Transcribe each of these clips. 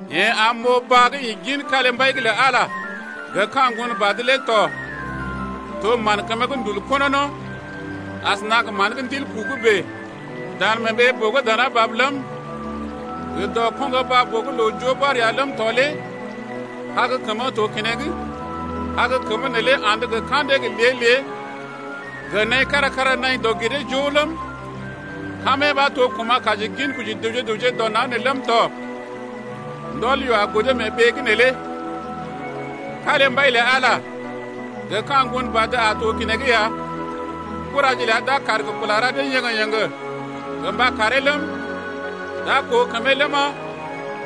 Yeḛ am m’oo baa gə́ ḭ gin kalimbai’g lə Ala gə ka̰ Ŋgonbad’g lé tɔ. To mán kəmə gə́ ndul konono asəna gə mán gə́ ndil ku’g bèe. Dan mee ɓee-boo gə́ dana bab ləm, gə dɔ koŋgo baa-boo’g loo joo bɔr ya ləm tɔ lé kag kəmə to keneŋ. Kag kəmə neelé andə gə ka̰dee gə lée-lée gə naḭ kára-kára naḭ dɔg-giree-joo ləm, kamee ɓa to gə́ kuma̰ kaji ginkoji dəwje gə raŋg dɔ naŋg nee ləm tɔ. Ndɔl yoo a godo mee ɓee’g neelé. Kalimbai lə Ala gə ka̰ Ŋgonbad a to keneŋ ya. Kuraje ləa d’a kaar gə kula ra dee yéŋgé-yéŋgé gə mba karee ləm, d’a koo kəmee ləma,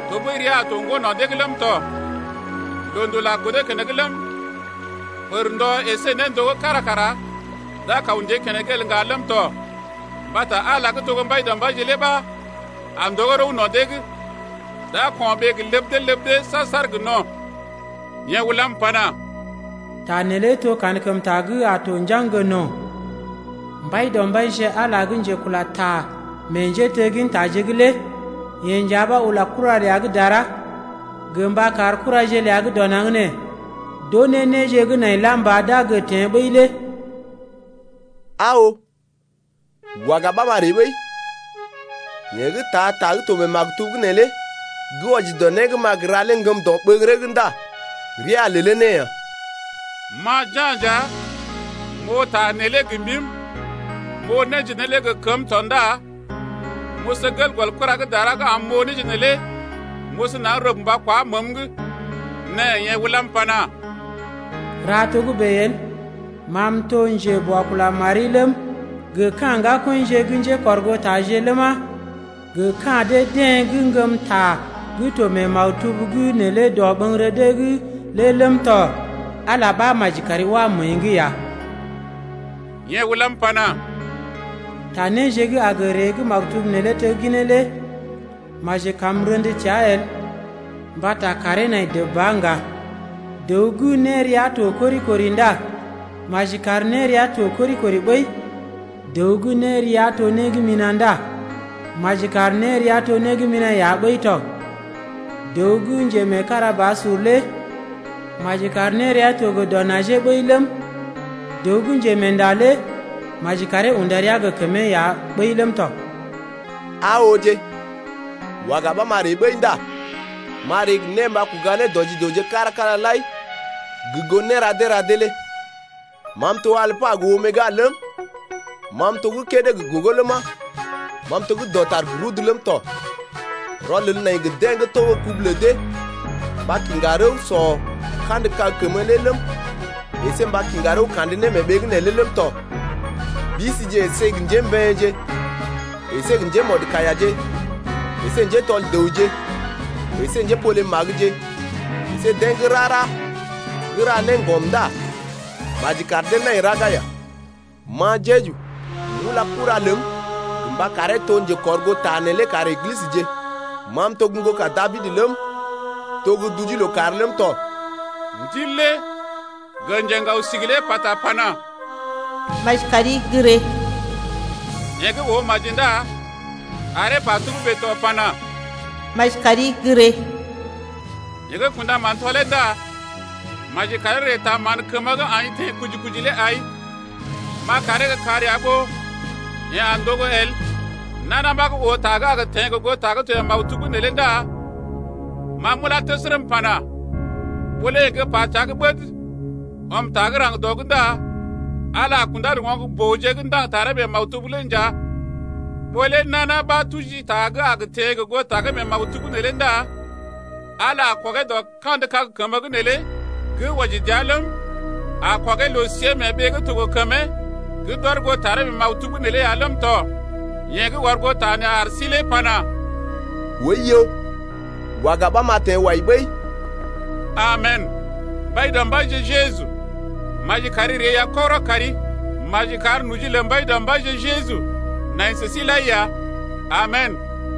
tɔɓəi ria a to ŋgo no̰ dee’g ləm tɔ. Loondul a godo keneŋ ləm, pərndɔ əsé néndogó kára kara d’a kaw ndée keneŋ el ŋga ləm tɔ mbata Ala gə́ to gə́ Mbaidɔmbaije lé ɓa a ndogó rəw no̰ dee’g. D’a ko̰ɓee gə ləb dee ləb dee saar-saar gə no̰. Yeḛ ulam pana: Ta neelé to kankəmta gə́ a to njaŋg gə no̰. Mbaidɔmbaije Ala gə́ njekula ta meḛ njéteggintaje’g lé yeḛ nja ɓa ula kura ləa gə́ dara gə mba kar kuraje ləa gə́ dɔ naŋg nee d’oo néje gə́ nai lam ba d’a gə teḛ ɓəi lé Aa oo, waga ɓa, n’a ree ɓəi, yeḛ gə́ taa ta gə́ to mee maktub’g neelé gə́ wɔji dɔ né gə́ ma gə ra lé ŋgəm dɔɓəŋgəree’g ndá rəa a lelee ne ya. Ma Ja̰ nja, m’oo ta neelé gə mbim, m’oo néje neelé gə kəm tɔ ndá m’oso gel gɔl kura gə́ dara gə́ am m’oo néje neelé m’oso naŋg rəb mba kwá məəm’g. Nɛ yeḛ ulam pana: Ra togə́bè el! Ma m’to gə́ njeboakula mari ləm, gə ka̰ ŋgakɔḭje gə́ njékɔrgootaje ləma, gə ka̰ dee-deḛ gə́ ŋgəm ta gə́ to mee maktub’g neelé dɔɓəŋgərə dee’g lé ləm tɔ. Ala ɓa maji kari wá məəi’g ya. Yeḛ ulam pana: Ta néje gə́ a gə ree gə́ maktub neelé tegginee lé maji kam m’rḛdə təa el. Mbata kàree nai dəb ba ŋga. Dəw gə́ nérea to kori-kori ndá maji kar nérea to kori-kori ɓəi. Dəw gə́ nérea to né gə́ mina̰ ndá maji kar nérea to né gə́ mina̰ ya ɓəi tɔ. Dəw gə́ njemeekarabasur lé maji kar nérea to gə dɔ najee ɓəi ləm, dəw gə́ njemeenda lé maji karee unda rəa gə kəmee ya ɓəi ləm tɔ. Aa ooje, waga ɓa m’a ree ɓəi ndá m’a ree gə né mba kuga ne dɔ ji dəwje kára-kára lai gə goo néra dee ra dee lé. Ma m’to Alpa gə Omega ləm, ma m’to gə́ kédé gə gogo ləma, ma m’to gə́ dɔtar gə rudu ləm tɔ. Rɔlel nai gə deḛ gə́ togo kubu lə dee mba kiŋga rəw sɔ kandə kag kəmə lé ləm, əsé mba kiŋga rəw kandə ne mee ɓee’g neelé ləm tɔ. Bisije əsé gə njémbeḛje əsé gə njémɔdkaiyaje əsé njétɔl dəwje əsé njépole-magəje əsé deḛ gə́ rara gə́ ra néŋgɔm ndá maji kar dee nai raga ya. Ma Jeju, m’ula kura ləm gə mba karee to njekɔrgoota neelé kar Eglisəje. Ma m’to gə́ ŋgoka Dabid ləm, m’to gə́ duje lookàr ləm tɔ. Ndil lé gə njeŋgao-sigi lé pata pana: Maji kari gə́ ree. Yeḛ gə́ oo maji ndá aree pa togə́bè tɔ pana: Maji kari gə́ ree. Yeḛ gə́ kṵdaman tɔlee ndá maji karee ree taa mán kəmə gə́ aḭ teḛ kuji-kuji lé ai, m’a karee gə́ kar ya ɓó yeḛ a ndogo el. Nana ɓa gə́ oo ta gə́ a gə teḛ gə goo ta gə́ to mee maktub’g neelé ndá ma m’ulá təsərə m’pana: Ɓó lé yeḛ pa təa gə́ ɓəd ɔm ta gə́ raŋg dɔ’g ndá Ala a kundá gə oŋg-booje gə́ ndaŋg taree mee maktub’g neelé nja. Ɓó lé nana ɓa tuji ta gə́ a gə teḛ gə goo ta gə́ to mee maktub’g neelé ndá Ala a kɔgee dɔ kandə kag kəmə’g neelé gə́ wɔji dəa ləm, a kɔgee loo-siée mee ɓee gə́ to gə kəmee gə́ d’ɔr goo taree mee maktub’g neelé ya ləm tɔ. Yeḛ gə́ ɔr goo ta nee ar sí lé pana: Oiyo, waga ɓa m’a teḛ wai ɓəi. Amen! Mbaidɔmbaije Jeju, maji kari ree ya kɔgərɔ kari. Maji kar noji lə Mbaidɔmbaije Jeju nai sə sí lai ya. Amen!